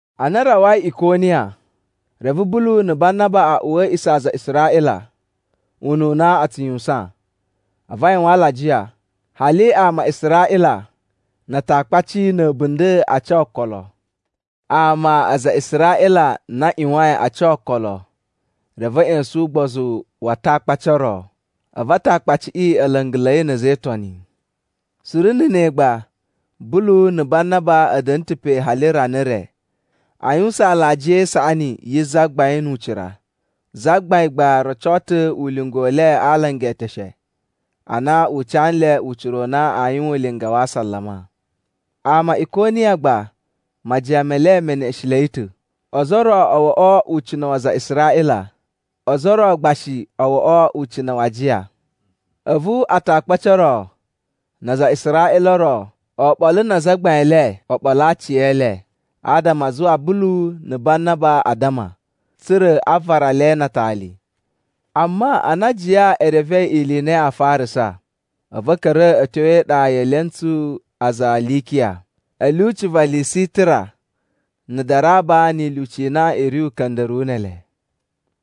Ana a rawai Ikoniya, reve Bulu na̱ Banaba a uwa a̱ a̱a̱ꞌisa̱ a aza a Israꞌila ununa a tsu yuwusan. A̱vu a yuwan alajiya, hali ama a Israꞌila na Atakpaci na̱ a̱bunda̱ a ca okolo. Ama aza a Israꞌila na a ꞌyuwain a ca okolo, reve a̱ ꞌya̱sa̱n ugbozu wa Atakpaci o ro. A̱vu Atakpaciꞌi a̱ la̱nga̱la̱i na̱ a̱za̱ e Itoni. Suru na̱ ne gba Bulu na̱ Banaba a̱ da̱nu ta̱ pe hali rana re a yuwusan alajiya e isaꞌani yi Zagbain nu ucira. Zagbain gba roco ta̱ ulinga u le a alanga e eteshe ana u ca nle ucira u na aa yuwan ulinga wa asalama. Ama a Ikoniya gba majiyan me le me neꞌeshenlei ta̱. Ozo o ro o woꞌo ucina̱ wa aza a Israꞌila, ozo o ro gba shi o woꞌo ucina̱ wa ajiya. A̱vu Atakpaci o ro na aza a Israꞌila o ro oɓolo na azagbain e le o ɓolo aciyele adama a zuwa Bulu na̱ Banaba a addama, tsa̱ra̱ a vara le na atali. Amma ana ajiya e revei ili i na yaa farasa, a̱vu a̱ ka̱ra̱ a̱ tyo e iɗa ye elentsu a aza a Likiya, a̱ lyuci va Lisitira na̱ Daraba ni ilyuci i na i ri uka̱nda̱ruwu ne ele.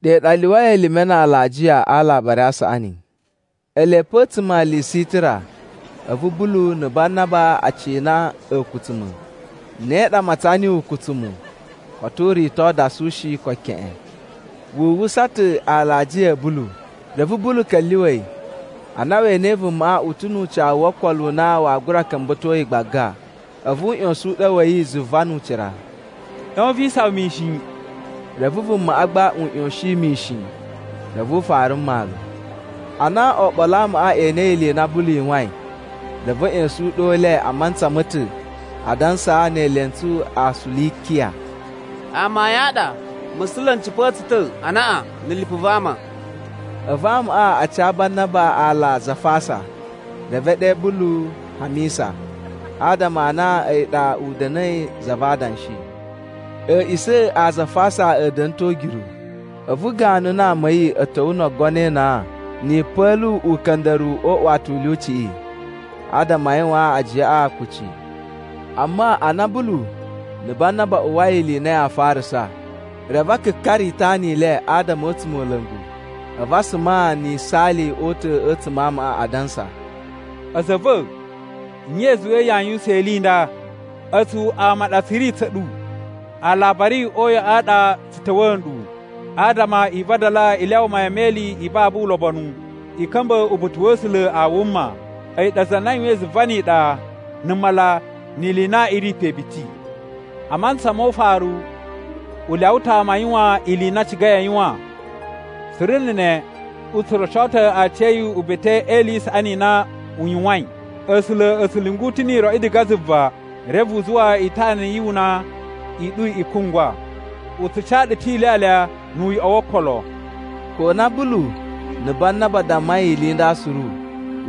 Ɗe ɗa a lyuwai elime na alajiya a Alabari a Saꞌani. Ele pe a̱tsuma̱ a Lisitira, a̱vu Bulu na̱ Banaba a cina a̱a̱kutsuma̱. Ne ɗa a matsan niyi ukutsumu, koto u rito dasu shi, ko keꞌen. Wu uwwusa ta̱ alajiya a̱ Bulu. Reve Bulu ka̱lyuwa̱ yi, ana we enei vumaꞌa u ta̱ nu ucawu wo okolo u na waa gura ka̱mba̱to yi gbaga, a̱vu u ꞌya̱sa̱n uɗyo wa̱ yi zuva nu ucira, “ꞌYon vi isawan mishin!” Reve vumaꞌa gba u ꞌyoshin mishin reve u fara mmalu. Ana oɓolo a amaꞌa e enei ili i na Bulu yuwain, reve a̱ ꞌya̱sa̱n uɗyo u le a mantsa ma̱ ta̱ adansa ne elentsu a Tsulikiya, “Amayun a ɗa musula̱ n cipa̱a̱ tsu ta̱ anaꞌan na̱ lipu va ama!” A̱vu amaꞌa a ca Banaba aala Zafasa, reve e ɗe Bulu Hamisa, adama a na a̱yi ɗa u da̱na̱i za va adanshi. A̱a̱ꞌisa̱ a Zafasa a̱ da̱na̱ ta̱ o ugyuru. A̱vu ganu na ama a̱ yi a̱ ta̱wa̱ no ogono e inan na̱ yipa̱lu uka̱nda̱ruwu o uꞌuwata u lyuciꞌi adama a yuwaan ajiyaꞌa kucci. Amma ana Bulu na̱ Banaba a uwwai ili i na yaa farasa, reve a kakara itana i le adama a̱ a̱tsumola̱ngu. A̱vu a suma na̱ yisaali o uta̱ a̱tsuma̱ a amaꞌa, adansa, “A̱za̱ a̱ va̱, nye i zuwai yaa yuwusan ili i nda? A̱tsu ama a ɗa tsu ri tsa̱ ɗu. Alabari o uyoꞌo a ɗa tsu ta̱wa̱a̱ nɗu, adama i vadala i lyawa mayan me ili i babu ulobonu i ka̱mba̱ uba̱ta̱ wa̱ A̱sula̱ a wuma. A̱yi ɗa za na yuwain zuva ni iɗa, na̱ mala, ni ili i na i ri pe biti. A mantsa mo ufaru, u lyawa ta̱ ama a yuwan ili i na a cigai a yuwan. Suru na̱ ne u tsu roco ta̱ aciya̱yi uba̱ta̱ e ili i saꞌani i na u yuwain. A̱sula̱ a̱ tsu lyungu ta̱ ni iroꞌi diga zuva, reve u zuwa itana yu una i ɗu i kungwa. U tsu ca ɗu ta̱ ilyalya nu uyoꞌo wo okolo.” Ko na Bulu na̱ Banaba a dammai ili i nda suru,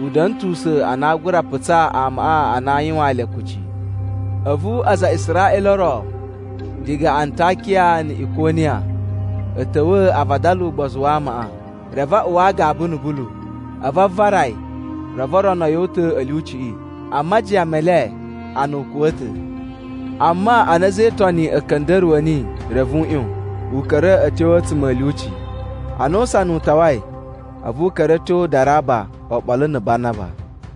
u da̱na̱ ta̱ usa̱n a na aa gura putsaa amaꞌa a na aa yuwaan le kucci. A̱vu aza a Israꞌila o ro diga Antakiya na̱ Ikoniya a̱ ta̱wa̱ a vadala ugbozu wa amaꞌa, reve a uwa agaba na̱ Bulu. A̱vu a vara yi, reve o rono yi o uta̱ a̱ lyuciꞌi, a majiyan me le a na u kuwa̱ ta̱. Amma ana a̱za̱ e Itoni a̱ ka̱nda̱ruwa̱ niyi reve u ꞌyon, u ka̱ra̱ a̱ tyo a̱tsuma̱ a̱ lyuci. Ana usana u tawai, a̱vu u ka̱ra̱ a̱ tyo Daraba oɓolo na̱ Banaba.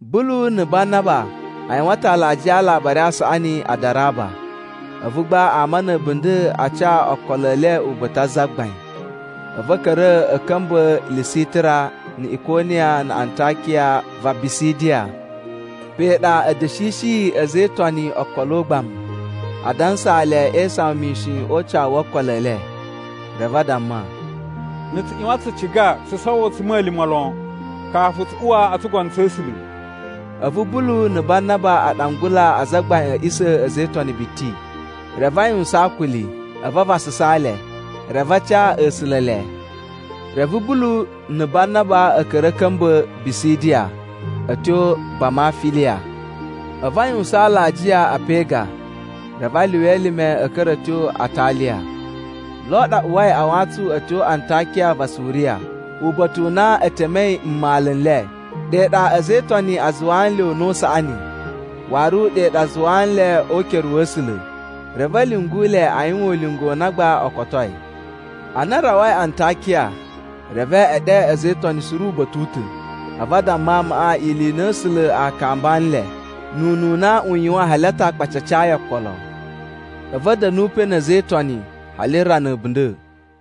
Bulu na̱ Banaba a yuwan ta̱ alajiya a Alabari a Saꞌani a Daraba, a̱vu gba ama na̱ a̱bunda̱ a ca okolo e le uba̱ta̱ a Zagbain. A̱vu a̱ ka̱ra̱ a̱ ka̱mba̱ Lisitira na̱ Ikoniya na̱ Antakiya va Bisidiya. Pe ɗa a̱ da̱shishiyi a̱za̱ e Itoni okolo ugbamu, a dansaa le e isawan mishin o ucawu wo okolo e le. Reve a damma, “Na̱ tsu ꞌyuwan tsu ciga tsu sowo a̱tsuma̱lima̱ lon, kafu tsu uwa o tsugono tsa̱ A̱sula̱.” A̱vu Bulu na̱ Banaba a ɗangula azagbain a̱ a̱ꞌisa̱ a̱ a̱za̱ e Itoni biti, reve a yuwusan akuli, a̱vu a vasasaa le, reve a ca A̱sula̱ ele. Reve Bulu na̱ Banaba a̱ ka̱ra̱ a̱ ka̱mba̱ Bisidiya a̱ tyo Bamafiliya. A̱vu a yuwusan alajiya a Pega, reve a lyuwa elime a̱ ka̱ra̱ a̱ tyo Ataliya. Lo ɗa a uwai a wantsun a̱ tyo Antakiya va Suriya, uba̱ta̱ u na e temei mmalu n le. Ɗe ɗa a̱za̱ e Itoni a zuwaa nle una̱ u saꞌani, waru ɗe ɗa a zuwa nle o ukere wa̱ A̱sula̱, reve a̱ lyungu le a yuwan ulinga u na gba o kotoi. Ana a rawai Antakiya reve e ɗe a̱za̱ e Itoni suru uba̱ta̱ u ta̱. A̱vu a damma amaꞌa ili i na A̱sula̱ a kamba nle nu ununa u yuwain hali Atakpaci a cayi okolo. A̱vu a̱ da̱nu pe na̱ a̱za̱ e Itoni hali rana a̱bunda̱.